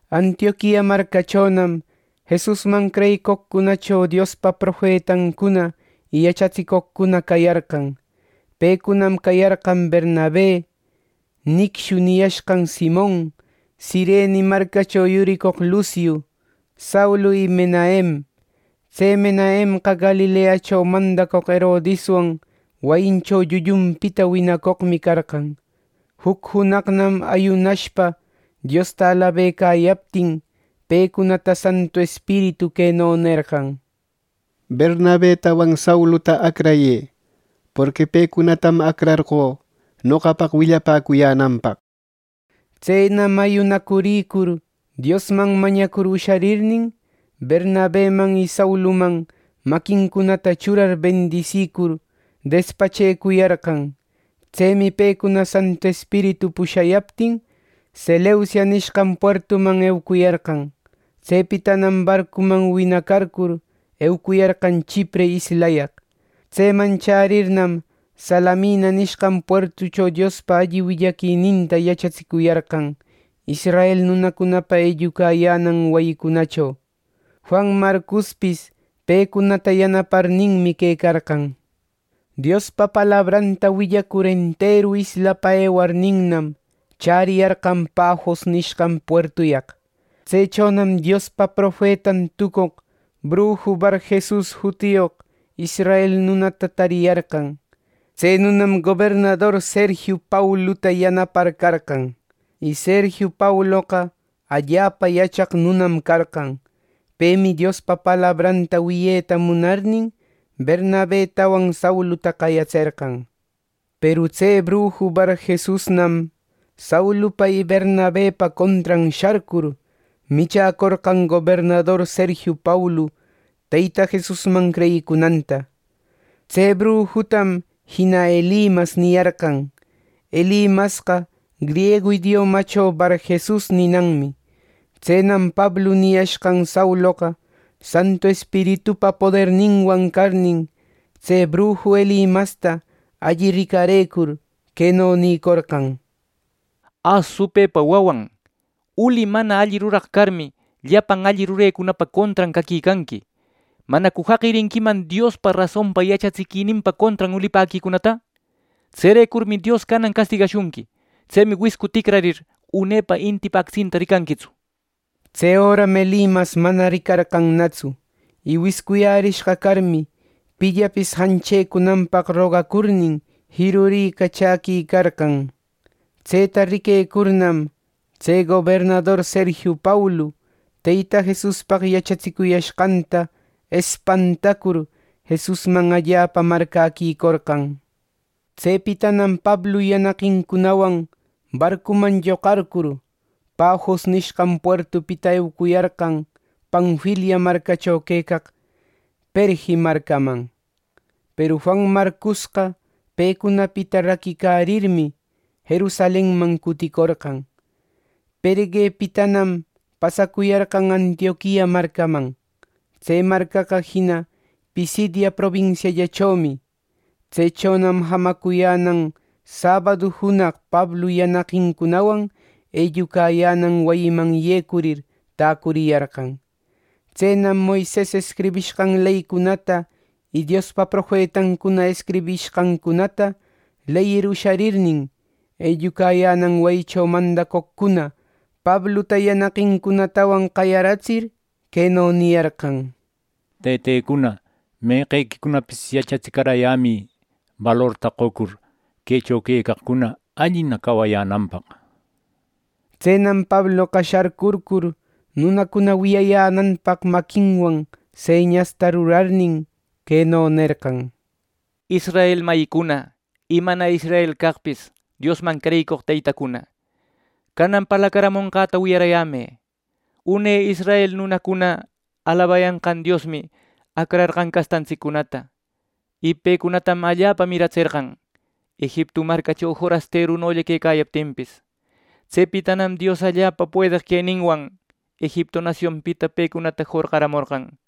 Antioquia marcachonam Jesusman creyicoqcunacho Diospa profetancuna y yachatsicoqcuna cayarqan. Pecunam cayarqan Bernabe, “Nicshu” niyashqan Simon, Cirene marcacho yuricoq Luciu, Saulu y Menahem. Tse Menahemqa Galileacho mandacoq Herodiswan wayincho llullunpita winacoqmi carqan. Juc junaqnam ayunashpa Diosta alabecayaptin, pecunata Santu Espiritu queno nerqan: “Bernabetawan Sauluta acrayë; porqui pecunatam acrarqö noqapaq willapäcuyänanpaq” nishpa. Tsenam ayunacurïcur Diosman mañacur usharirnin, Bernabeman y Sauluman maquincunata churar ˻bendisicur˼, despachecuyarqan. Tsemi pecuna Santu Espiritu pushayaptin, Seleucia nishqan puertuman eucuyarqan. Tsepitanam barcuman winacarcur, eucuyarqan Chipre islayaq. Tseman chärirnam, Salamina nishqan puertucho Diospa alli willaquininta yachatsicuyarqan israel nunacunapa ellucayänan wayicunacho. Juan Marcospis pecunata yanaparninmi quecarqan. Diospa palabranta willacur enteru islapa ewarninnam, chäriyarqan Pafos nishqan puertuyaq. Tsechonam Diospa profetan tucoq brujo Barjesus jutiyoq israel nunata tariyarqan. Tse nunam gobernador Sergiu Pauluta yanapar carqan. Y Sergiu Pauloqa allapa yachaq nunam carqan. Pemi Diospa palabranta wiyeta munarnin, Bernabetawan Sauluta qayatserqan. Peru tse brujo Barjesusnam, Saulupa y Bernabepa contran sharcur, michäcorqan gobernador Sergiu Paulu Teyta Jesusman creyicunanta. Tse brujutam jina Elimas niyarqan, Elimasqa griegu idiomacho Barjesus ninanmi. Tsenam Pablu niyashqan Sauloqa Santu Espiritupa poderninwan carnin, tse bruju Elimasta alli ricarëcur, queno nïcorqan: —Ä ¡supëpa wawan! Uli mana alli ruraq carmi, llapan alli rurecunapa contran caquicanqui. ¿Manacu jaqirinquiman Diospa rasonpa yachatsiquininpa contran ulipäquicunata! Tserecurmi Dios canan castigashunqui. Tsemi wiscu ticrarir, unepa intipa actsinta ricanquitsu —nishpa. Tse öram Elimas mana ricarqannatsu. Y wiscuyärishqa carmi, pillapis janchecunanpaq rogacurnin, jiruricachäquicarqan. Tseta riquecurnam, tse gobernador Sergiu Paulu, Teyta Jesuspaq yachatsicuyashqanta espantacur, Jesusman allapa marcäquicorqan. Tsepitanam Pablu yanaqincunawan barcuman lloqarcur, Pafos nishqan puertupita eucuyarqan Panfilia marcacho quecaq Perge marcaman. Peru Juan Marcosqa pecunapita raquicarirmi, Jerusalenman cuticorqan. Pergepitanam pasacuyarqan Antioquia marcaman; tse marcaqa jina Pisidia probinisiallachomi. Tsechonam jamacuyänan sabadu junaq Pablu yanaqincunawan ellucayänan wayiman yecurir, täcuriyarqan. Tsenam Moises escribishqan leycunata y Diospa profetancuna escribishqancunata leyir usharirnin, ellucayänan wayicho mandacoqcuna Pabluta yanaqincunatawan qayaratsir, queno niyarqan: —Tëtecuna, meqequicunapis yachatsicarayämï, balorta qocur, quecho quecaqcuna allina cawacuyänanpaq —nishpa. Tsenam Pabloqa sharcurcur nunacuna wiyayänanpaq maquinwan señasta rurarnin, queno nerqan: —Israel mayïcuna, y mana israel caqpis Diosman creyicoq tëtecuna, canan parlacaramonqäta wiyaräyämë. Une israel nunacuna alabayanqan Diosmi acrarqan castantsiccunata. Y pecunatam allapa miratserqan, Egiptu marcacho forasterulla quecayaptinpis. Tsepitanam Dios allapa puedeq queninwan Egiptu nasionpita pecunata jorqaramorqan.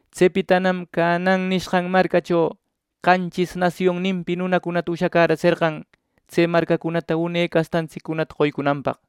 Tsepitanam Canaan nishqan marcacho qanchis nasionninpi nunacunata ushacäratserqan tse marcacunata une castantsiccunata qoycunanpaq.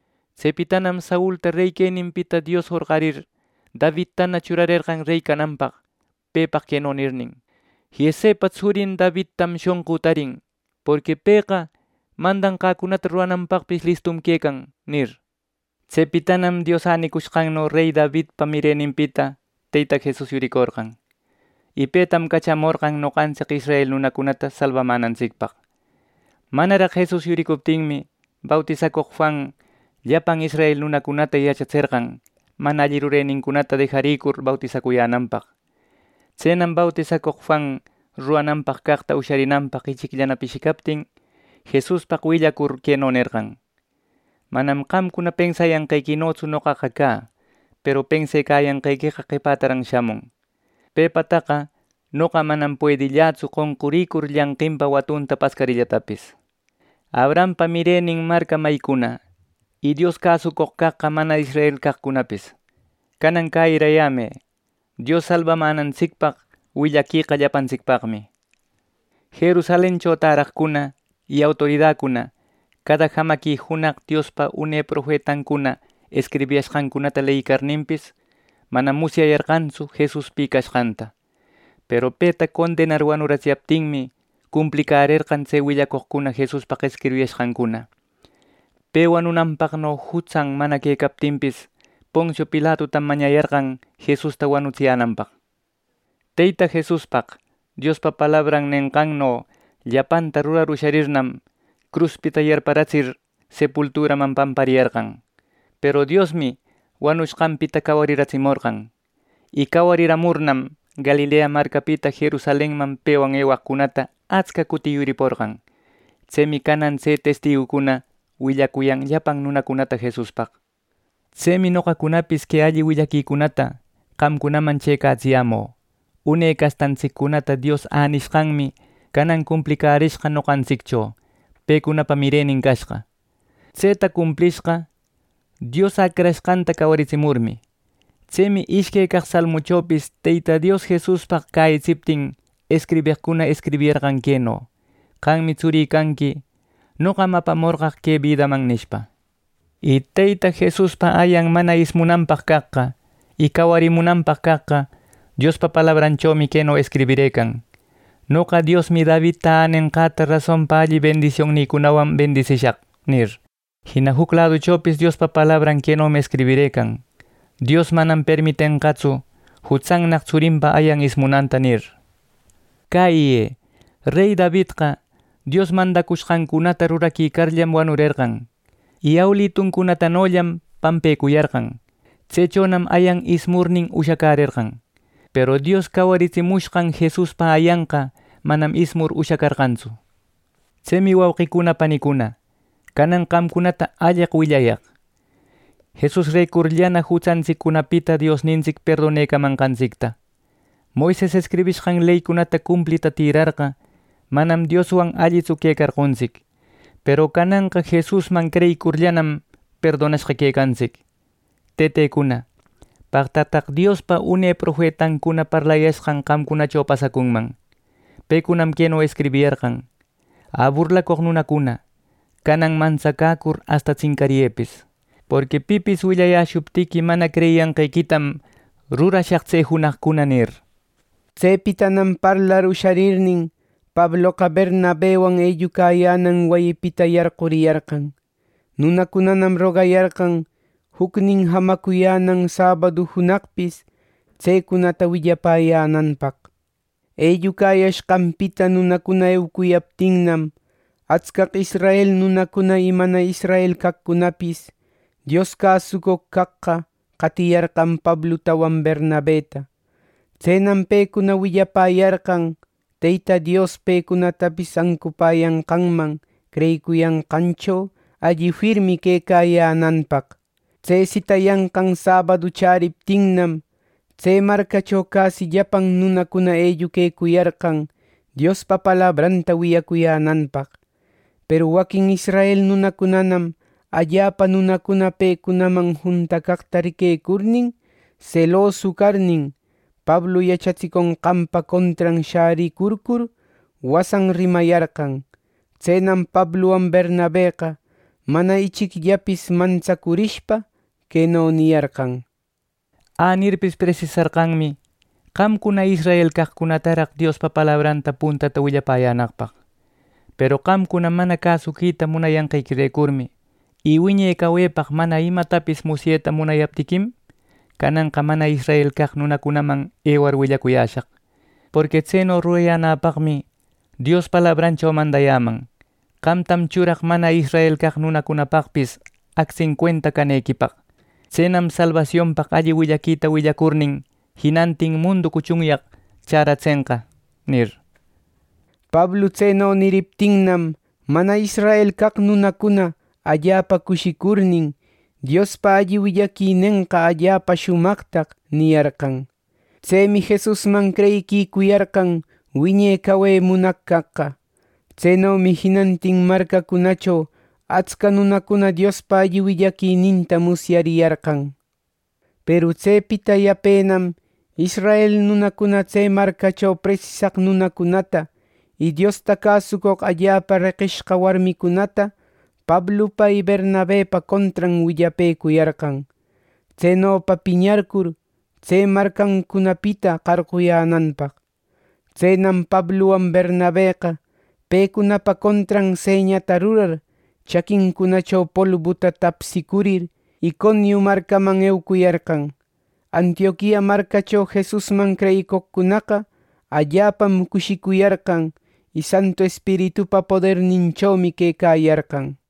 Tsepitanam Saulta rey queninpita Dios jorqarir, Davidtana churarerqan rey cananpaq, pepaq queno nirnin: ‘Jesepa tsurin Davidtam shonqü tarin, porqui pëqa mandanqäcunata rurananpaqpis listum quecan’, nir. Tsepitanam Dios änicushqanno rey Davidpa mireninpita Teyta Jesus yuricorqan. Y petam cachamorqan noqantsic israel nunacunata salbamänantsicpaq. Manaraq Jesus yuricuptinmi, bautisacoq Juan llapan israel nunacunata yachatserqan, mana alli rurenincunata dejarïcur bautisacuyänanpaq. Tsenam bautisacoq Juan rurananpaq caqta usharinanpaq ichicllana pishicaptin, Jesuspaq willacur, queno nerqan: ‘Manam qamcuna pensayanqequinotsu noqaqa cä; peru pensecayanqequeqa qepätaran shamun. Pepataqa noqa manam puedillätsu qonqurïcur llanqinpa watunta pascarïllatapis.’ “Abrahampa mirenin marca mayicuna, y Dios cäsucoq caqqa mana israel caqcunapis, canan cäyirayämë. Dios salbamänantsicpaq willaqueqa llapantsicpaqmi. Jerusalencho täraqcuna y autoridacuna, cada jamaqui junaq Diospa une profetancuna escribiyashqancunata leyicarninpis, manam musyayarqantsu Jesus pi cashqanta. Peru peta condenar wanuratsiyaptinmi, cumplicärerqan tse willacoqcuna Jesuspaq escribiyashqancuna. Pe wanunanpaqno jutsan mana quecaptinpis, Poncio Pilatutam mañayarqan Jesusta wanutsiyänanpaq. Teyta Jesuspaq Diospa palabran nenqanno llapanta rurar usharirnam, cruspita yarparatsir sepulturaman pampariyarqan. Peru Diosmi wanushqanpita cawariratsimorqan. Y cawariramurnam, Galilea marcapita Jerusalenman pewan ewaqcunata atsca cuti yuriporqan. Tsemi canan tse testigucuna willacuyan llapan nunacunata Jesuspaq. “Tsemi noqacunapis que alli willaquicunata qamcunaman chëcatsiyämü. Une castantsiccunata Dios änishqanmi canan cumplicärishqa noqantsiccho, pecunapa mirenin cashqa. Tseta cumplishqa, Dios Acrashqanta cawaritsimurmi. Tsemi ishque caq Salmuchopis Teyta Dios Jesuspaq cäyitsiptin, escribeqcuna escribiyarqan queno: ‘Qammi tsurï canqui; noqam apamorqaq que bidaman’ nishpa. Y Teyta Jesuspa ayan mana ismunanpaq caqqa y cawarimunanpaq caqqa, Diospa palabranchomi queno escribirëcan: ‘Noqa Diosmi Davidta änenqäta rasonpa alli bendisioncunawan bendisishaq’ nir. Jina juc laduchopis Diospa palabran quenomi escribirëcan: ‘Dios manam permitenqatsu jutsannaq tsurinpa ayan ismunanta’ nir. Cäyiyë: Rey Davidqa Dios mandashqancunata ruraquicarllam wanurerqan. Y awiluncunatanollam pampecuyarqan; tsechonam ayan ismurnin ushacarqan. Peru Dios cawaritsimushqan Jesuspa ayanqa manam ismur ushacarqantsu. Tsemi, wauqicuna panicuna, canan qamcunata alleq willayaq: Jesusrecurllana jutsantsiccunapita Diosnintsic perdonecamanqantsicta. Moises escribishqan leycunata cumplita tïrarqa, manam Dioswan allitsu quecarqontsic. Peru cananqa Jesusman creyicurllanam perdonashqa quecantsic. Tëtecuna, paqtataq Diospa une profetancuna parlayashqan qamcunacho pasacunman. Pecunam queno escribiyarqan: ‘Ä, burlacoq nunacuna, canan mantsacäcur asta tsincariyëpis. Porqui pipis willayäshuptiqui, mana creyiyanqequitam rurashaq tse junaqcuna’ nir.” Tsepitanam parlar usharirnin, Pabloqa Bernabewan ellucayänan wayipita yarquriyarqan. Nunacunanam rogayarqan jucnin jamacuyänan sabadu junaqpis tsecunata willapäyänanpaq. Ellucayashqanpita nunacuna eucuyaptinnam, atscaq israel nunacuna y mana israel caqcunapis Dios cäsucoq caqqa qatiyarqan Pablutawan Bernabeta. Tsenam pecuna willapäyarqan Teyta Dios pecunatapis ancupäyanqanman creyicuyanqancho alli firmi quecayänanpaq. Tse sitayanqan sabadu chäriptinnam, tse marcacho casi llapan nunacuna elluquecuyarqan Diospa palabranta wiyacuyänanpaq. Peru waquin israel nunacunanam allapa nunacuna pecunaman juntacaqta riquecurnin, selosu carnin, Pablu yachatsiconqanpa contran shäricurcur, wasan rimayarqan. Tsenam Pabluwan Bernabeqa mana ichicllapis mantsacurishpa, queno niyarqan: —Änirpis presisarqanmi qamcuna israel caqcunataraq Diospa palabranta puntata willayänaqpaq. Peru qamcuna mana cäsuquita munayanqequirecurmi, y wiñe cawepaq mana imatapis musyeta munayaptiquim, cananqa mana israel caq nunacunaman ewar willacuyäshaq. Porqui tseno rurayänäpaqmi Dios palabrancho mandayäman: ‘Qamtam churaq mana israel caq nunacunapaqpis actsin cuenta canequipaq. Tsenam salbasionpaq alli willaquita willacurnin, jinantin mundu cuchunyaq chäratsenqa’ nir. Pablu tseno niriptinnam, mana israel caq nunacuna allapa cushicurnin, “Diospa alli willaquinenqa allapa shumaqtaq” niyarqan. Tsemi Jesusman creyiquicuyarqan wiñe cawe munaq caqqa. Tsenomi jinantin marcacunacho atsca nunacuna Diospa alli willaquininta musyariyarqan. Peru tsepita yapenam israel nunacunana tse marcacho presisaq nunacunata y Diosta cäsucoq allapa reqishqa warmicunata Pablupa y Bernabepa contran willapëcuyarqan, tsenopa piñarcur, tse marcancunapita qarquyänanpaq. Tsenam Pabluwan Bernabeqa, pecunapa contran señata rurar, chaquincunacho polbuta tapsicurir, Iconiu marcaman eucuyarqan. Antioquia marcacho Jesusman creyicoqcunaqa allapam cushicuyarqan; y Santu Espiritupa poderninchomi quecayarqan.